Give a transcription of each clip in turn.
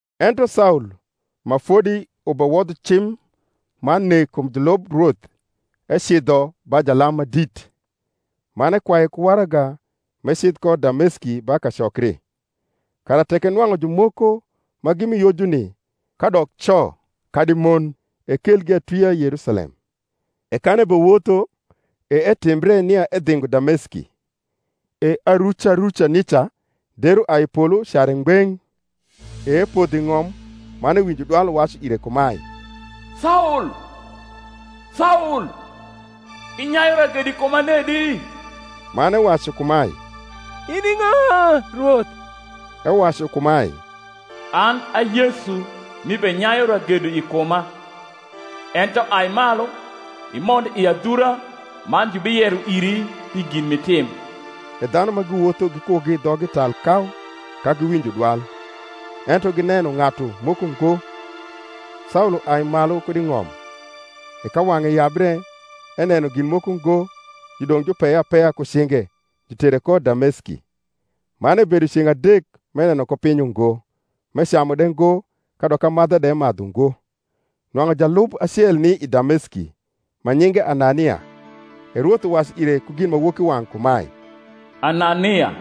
Ento Saul, ma fodi ubewodho cim man nek kum julub Rwoth, ecidho ba jalam ma dit, man ekwaye ku waraga m’ecidh ko Dameski ba kacokri, kara tek enwang’u jumoko ma gi mi Yojuni, kadok co kadi mon, ekelgi atwia Yerusalem. E kan ebewotho, e etimbre nia edhingo Dameski: e aruca ruca nica der uai i polo ucare ngbeng’: e epodho i ng’om, man ewinjo dwal uwacu ire kumae, Saul, Saul, inyayu ragedo i kuma nedi? Man ewacu kumae, In i ng’a, Rwoth? Ewacu kumae, An a Yesu m’ibenyayu ragedo i kuma: ento ai malu, imond i adhura, man jubiyero iri pi gin m’itim. E dhanu ma giwotho gikugi dhoggi tal kau ka giwinjo dwal, ento gineno ng’atu moko ngo. Saul uai malu kud i ng’om; e ka wang’e yabre, eneno gin moko ngo; judong’ jupeye apeya ku cinge, jutere ko Dameski. Man ebedo ceng’ adek m’eneno ko piny ungo, m’ecamu de ngo kadok amadha de emadhu ngo. Nwang’u jalub acel ni i Dameski, ma nyinge Anania; e Rwoth uwacu ire ku ginmawokiwang’ kumae, Anania.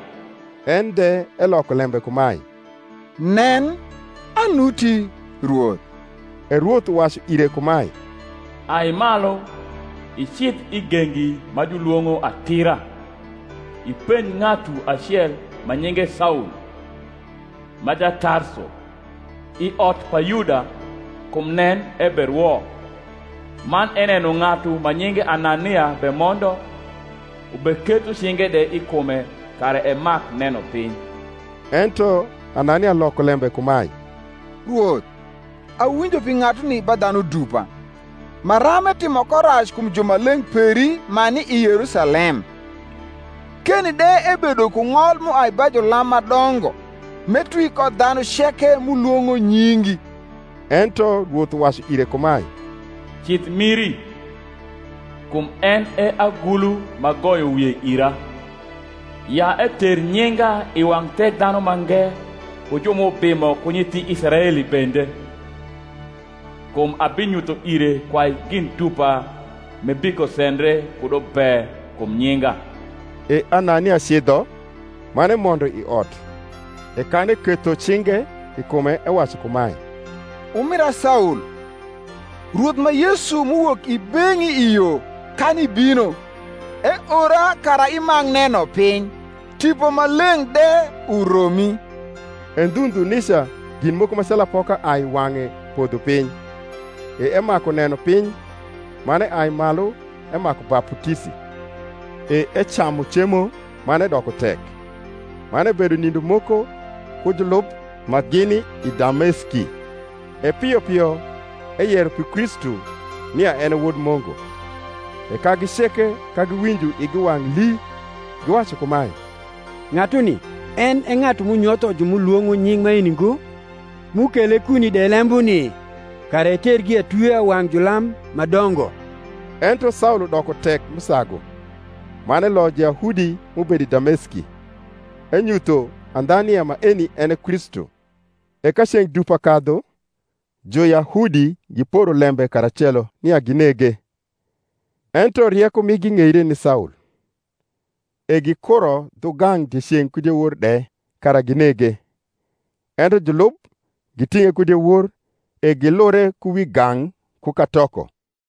En de eloko lembe kumae, Nen, anuti, Rwoth. E Rwoth uwacu ire kumae, Ai malu, icidh i gengi ma julwong’o Atira, ipenj ng’atu acel ma nyinge Saul, ma Jatarso, i ot pa Yuda: kum nen, eberwo; man eneno ng’atu ma nyinge Anania bemondo, ubeketho cinge de i kume kara emak neno piny. Ento Anania loko lembe kumae, Rwoth, awinjo pi ng’atuni ba dhanu dupa, maram etimo ko rac kum jumaleng’ peri ma ni i Yerusalem: keni de ebedo ku ng’ol m’uai ba julam ma dongo m’etwi ko dhanu ceke m’ulwong’o nyingi. Ento Rwoth uwacu ire kumae, Cidh miri: kum en e agulu m’agoyo wie ira, ya eter nyinga i wang’ Thekdhanumange ku ju m’ubimo ku nyithi Israeli bende: kum abinyutho ire kwai gin dupa m’ebikosendre kudo be kum nyinga. E Anania cidho, man emondo i ot; e kan eketho cinge i kume ewacu kumae, Umira Saul, Rwoth ma Yesu m’uwok i beng’i i yo kan ibino, eora kara imak neno piny, Tipo Maleng’ de uromi. E ndhu ndhu nica gin moko ma calu apoka ai i wang’e podho piny, e emaku neno piny; man eai malu emaku baputisi; e ecamu cemo man edoko tek. Man ebedo nindo moko ku julub ma gini i Dameski, e pio pio eyero pi Kristu nia en e Wod Mungu. E kagi ceke ka giwinjo igi wang’ lii, giwacu kumae, Ng’atuni en e ng’atu m’unyotho ju m’ulwong’o nying’ maeni ngo? m’ukele kuni de lembuni, kara etergi atwia wang’ julam ma dongo. Ento Saul udoko tek m’usagu, man eloyo Juyahudi m’ubedo i Dameski, enyutho andha nia maeni en e Kristu. E ka ceng’ dupa kadhu, Juyahudi giporo lembe karacelo nia ginege: ento rieko migi ng’eire ni Saul. E gikuro dhugang’ dieceng’ ku diewor de kara ginege: ento julub giting’e ku diewor, e gilure ku wi gang’ ku katoko.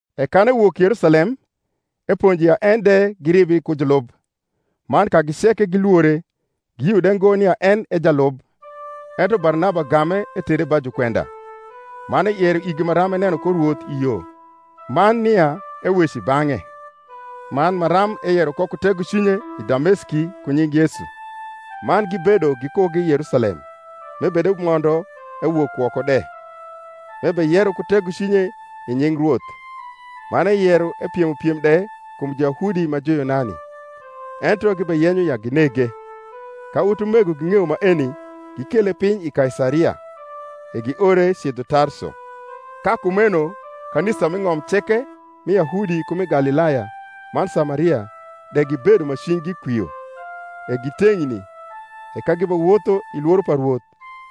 E kan ewok Yerusalem, eponjo ya en de giribri ku julub: man kagi ceke gilwore, giyio de ngo nia en e jalub. Ento Barnaba game, etere ba jukwenda, man eyero igi maram eneno ko Rwoth i yo, man nia eweco i bang’e, man maram eyero ko ku tegocwinye i Dameski ku nying Yesu. Man gibedo gikugi Yerusalem m’ebedemondo ewok woko de, m’ebeyero ku tegocwinye i nying Rwoth: man eyero epiemo piem de kum Juyahudi ma Juyunani; ento gibeyenyo ya ginege. Ka utumego ging’eyo maeni, gikele piny i Kaisaria, e giore cidho Tarso. Ka kumeno kanisa m’i ng’om ceke mi Yahudi ku mi Galilaya man Samaria de gibedo ma cwinygi kwio, e giteng’ni; e ka gibewotho i lworo pa Rwoth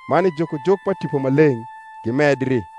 man i jukojuk pa Tipo Maleng’, gimedri.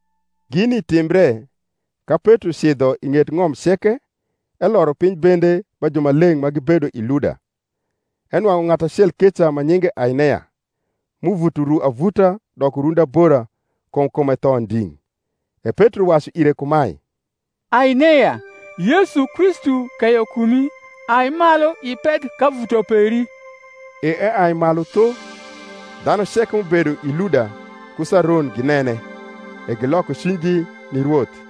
Gini timbre, ka Petro cidho i ng’et ng’om ceke, eloro piny bende ba jumaleng’ ma gibedo i Luda. Enwang’u ng’atu acel keca ma nyinge Ainea, m’uvuto ru avuta doko rundi abora; kum kume tho nding’. E Petro wacu ire kumae, Ainea, Yesu Kristu keyo kumi: ai malu, ipedh kavuto peri. E eai malu tho. Dhanu ceke m’ubedo i Luda ku Saron ginene, e giloko cwinygi ni Rwoth.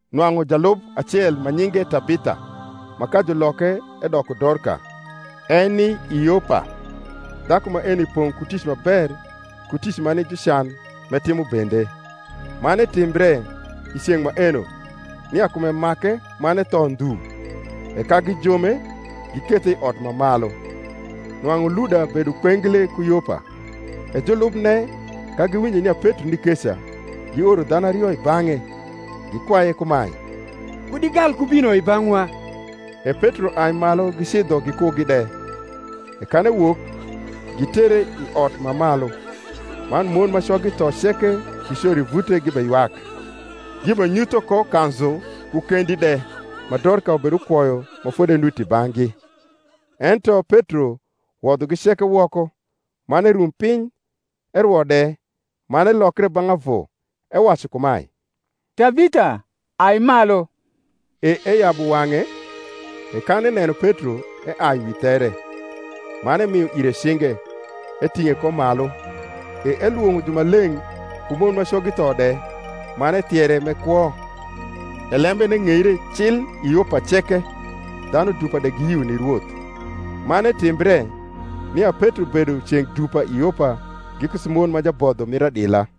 Nwang’u jalub acel ma nyinge Tabitha, ma ka juloke edoko Dorka, eni i Yopa: dhaku maeni pong’ ku tic ma ber ku tic ma ni jucan m’etimo bende. Man etimbre i ceng’ maeno, nia kume make, man etho ndhu: e ka gijome, gikethe i ot ma malu. Nwang’u Luda bedo kpengle ku Yopa, e julubne, ka giwinjo nia Petro ni keca, gioro dhanu ario i bang’e, gikwaye kumae, Kud igal ku bino i bang’wa. E Petro ai malu gicidho gikugi de. E kan ewok, gitere i ot ma malu: man mon ma coggi tho ceke gicoro i vute gibeywak, gibenyutho ko kanzu ku kendi de ma Dorka ubedukwoyo ma fodi enuti i bang’gi. Ento Petro wodhogi ceke woko, man erum piny, erwo de; man elokre bang’ avu, ewacu kumae, Tabitha, ai malu. E eyabu wang’e, e kan eneno Petro, eai wi there. Man emio ire cinge, eting’e ko malu; e elwong’o jumaleng’ ku mon ma coggi tho de, man ethiere m’e kwo. E lembene ng’eire cil i Yopa ceke: dhanu dupa de giyio ni Rwoth. Man etimbre, nia Petro bedo ceng’ dupa i Yopa giku Simon ma jabodho mir adila.